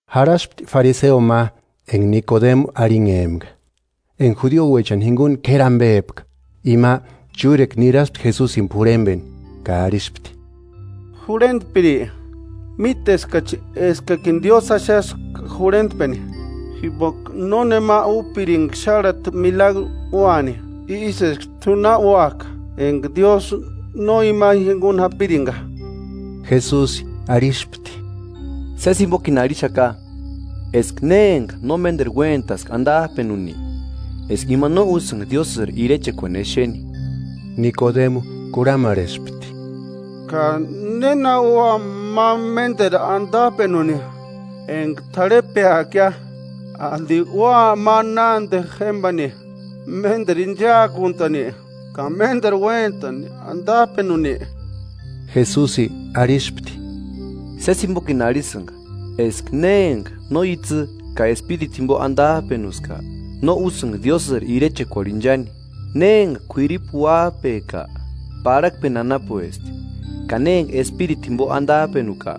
Jarhaspti fariseo ma, enga Nikodemu arhinhempka, enga judiouechani jinguni k'éri ambepka. Ima chúrekua niraspti Jesusini p'urhembeni, ka arhispti: –Jurhentpiri, míteskachi eskakini Diósï axaska jurhentpeni, jimboka nónema úpiringa xárhati milagru úani ísï eska t'u na úajka, enga Diósï no ima jinguni japiringa. Jesusi arhispti: –Sési jimbokini arhixaka eska ne enga no ménderu uéntaska andajpenuni, eska ima no úsïnga Diósïri Irechekuani exeni. Nikodemu kurhamarhespti: –¿Ka néna ua ma ménderu andajpenuni enga t'arhepeakia? ¿Andi ua ma nánde jémbani ménderu inchaakuntani, ka ménderu uéntani andajpenuni? Jesusi arhispti: –Sési jimbokini arhisïnga eska ne enga no itsï ka espiritu jimbo andajpenuska, no úsïnga Diósïri Irechekuarhu inchani. Ne enga k'uiripu uájpeka, parhakpeni anapuesti, ka ne enga espiritu jimbo andajpenuka,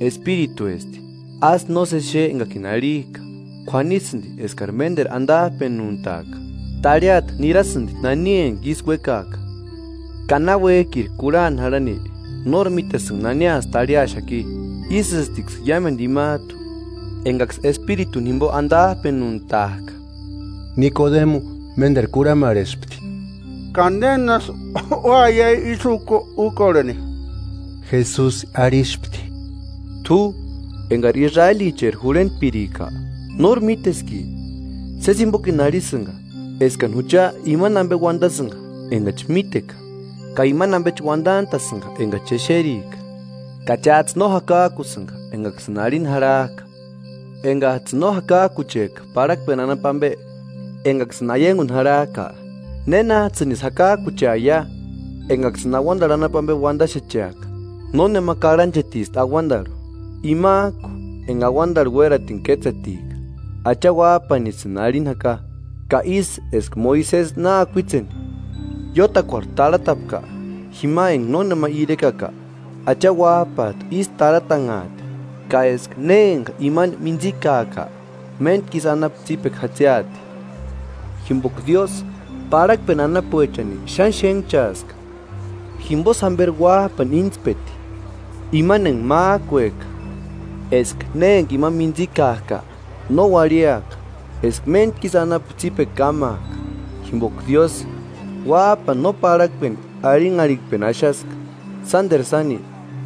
espirituesti. Ásï nósesi xe engakini arhijka: K'uanisïndi eskari ménderu andajpenuntaaka. Tarhiata nirasïndi nani enga isï uékajka, ka náuejki ri kurhani jarhani, nóri mítesïnga naniasï tarhiaxaki. Ísïstiksï iámendu imajtu engaksï espirituni jimbo andajpenuntajka. Nikodemu ménderu kurhamarhespti: –¿Ka nénasï úaia ísï úkorheni? Jesusi arhispti: –T'u, engari Israelicheri jurhentpirika, ¿Nóri míteski? Sési jimbokini arhisïnga eskani jucha imani ambe uandasïnga engachi míteka, ka imani ambechi uandantasïnga engachi exerika; ka chájtsï no jakajkusïnga engaksïni arhini jarhajka. Engajtsïni no jakajkuchejka parhakpeni anapu ambe engaksïni aianguni jarhajka, ¿Nénajtsïnisï jakajkucheaia engaksïni auandarhu anapu ambe uandaxecheaka? “Nónema karhanchetisti auandarhu, imajku enga auandarhu uératini kétsetika; Acha Uájpanisïni arhini jaka. Ka ísï eska Moisesi na akuitseni iótakuarhu tarhatapka jima enga nónema irekaka, Acha Uájpajtu ísï tarhatanhaati, ka eska ne enga imani mintsikaaka, méntku isï anapu tsípekua jatsiati.” “Jimboka Diósï parhakpeni anapuechani xáni xénhchaaska jimbosï jamberi Uájpani íntspeti, imani enga májkueka, eska ne enga imani mintsikajka no uarhiaka, eska méntku isï anapu tsípekua kámaaka. Jimboka Diósï, Uájpani no parhakpeni arhinharhikpeni axaska, sánderu sáni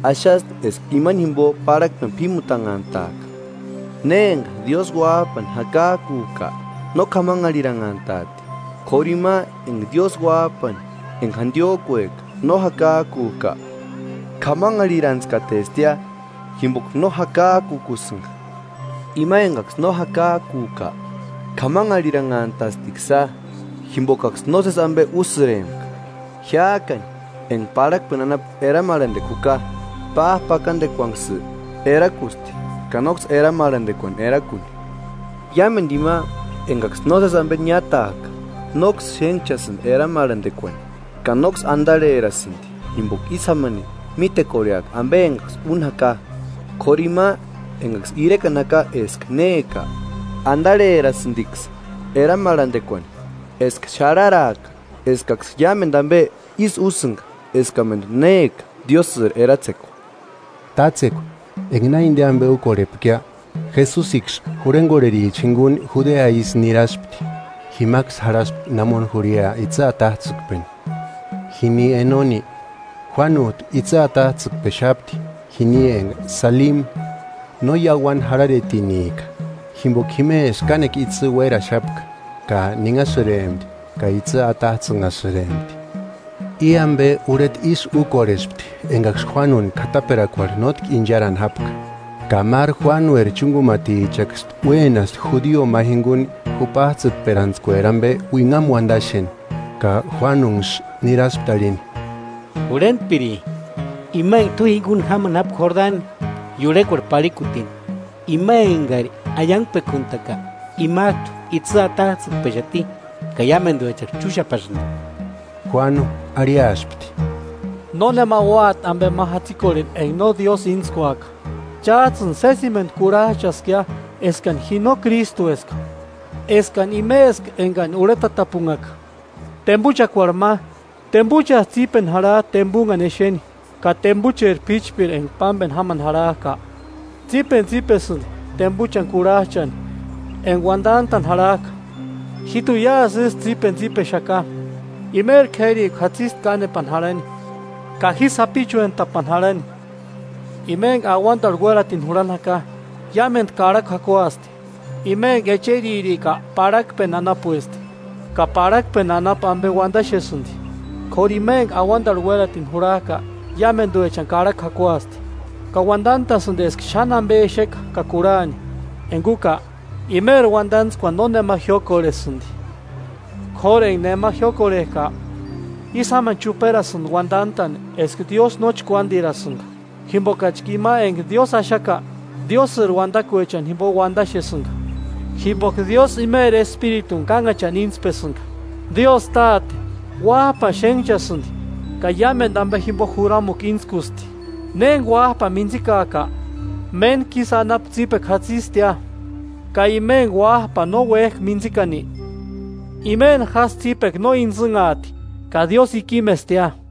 axasti eska imani jimbo parhakpeni p'ímutanhantaaka.” “Ne enga Diósï Uájpani jakajkujka, no k'amanharhiranhantaati; k'óru ima enga Diósï uájpani enga jandiójkueka no jakajkujka, k'amanharhirantskatestia jimboka no jakajkukusïnga. Ima engaksï no jakajkujka, k'amanharhiranhantastiksïa, jimbokaksï nósesi ambe úsïrempka. Jiájkani enga parhakpeni anapu eramarhandekua juka, pájpakandekuanksï erakusti ka nóksï eramarhandekuani erakuni. Iámendu ima engaksï nósesi ambe niátajka nóksï xénhchasïndi eramarhandekuani, ka nóksï andarherasïndi jimboka ísï jámani mítekorheaka ambe engaksï úni jaka. K'óru ima engaksï irekani jaka eska néka, andarherasïndiksï eramarhandekuani, eska xarharaaka eskaksï iámendu ambe ísï úsïnga eskamendu néka Diósïri eratsekua.” Tátsekua enga na inde ambe úkorhepkia, Jesusiksï jurhengorhericha jinguni Judea isï niraspti, jimaksï jarhaspti namoni jurhia itsï atajtsïkpeni. Jini Enoni, Juánujtu itsï atajtsïkpexapti, jini enga Salimi no iauani jarharetinika, jimboka jimesï kánekua itsï uéraxapka; ka ninhasïrempti ka itsï atajtsïnhasïrempti. I ambe, urheta ísï úkorhespti engaksï Juánuni k'ataperakuarhu nótki incharani jápka. Ka máru Juánueri chúngumatichaksï uénaspti judio ma jinguni jupajtsïtperantskueri ambe uinhamu uandaxeni, ka Juánuniksï niraspti arhini: –Jurhentpiri, ima enga t'u jinguni jámani jápka Jordani iurhekuarhu parhikutini, ima engari aiangpekuntaka, imajtu itsï atajtsïkpexati ka iámenduksï chúxapasïndi. Juánu arhiaspti: –Nónema úati ambe ma jatsikorheni enga no Diósï íntskuaka. Chájtsïni sésimendu kurhajchaskia eskani ji no Krístueska, eskani imeska engani urhetatapunhaka. Tembuchakuarhu ma, tembuchasï tsípeni jarhajti tembunhani exeni; ka tembucheri p'íchpiri enga pámbeni jámani jarhajka, tsípenitsipesïndi tembuchani kurhajchani enga uandantani jarhajka. Jíjtuni iásï ísï tsípenitsipexaka. Imeri k'érikua jatsisti kánepani jarhani, ka ji sapichuentapani jarhani. “Ima enga auandarhu uératini jurhani jaka, iámendu karhakua jakuasti. Ima enga echeririka parhakpeni anapuesti, ka parhakpeni anapu ambe uandaxesïndi. K'óru ima enga auandarhu uératini jurhajka iámenduechani karhakua jakuasti, ka uandantasïndi eska xáni ambe exeka ka kurhani; enga úka, imeri uandantskuani nónema jiókorhesïndi. K'óru enga nema jiókorhejka, ísï jámani chuperasïndi uandantani eska Diósï no chkuándirasïnga; jimbokachka ima enga Diósï axaka, Diósïri uandakuechani jimbo uandaxesïnga, jimboka Diósï imeri Espirituni kánhachani íntspesïnga. Diósï Táte, Uájpani xénhchasïndi, ka iámendu ambe jimbo juramukua íntskusti. Ne enga Uájpani mintsikajka, méntku isï anapu tsípekua jatsistia, ka ima enga Uájpani no uéjka mintsikani, imeni jásï tsípekua no intsïnhaati, ka Diósï ikimestia.”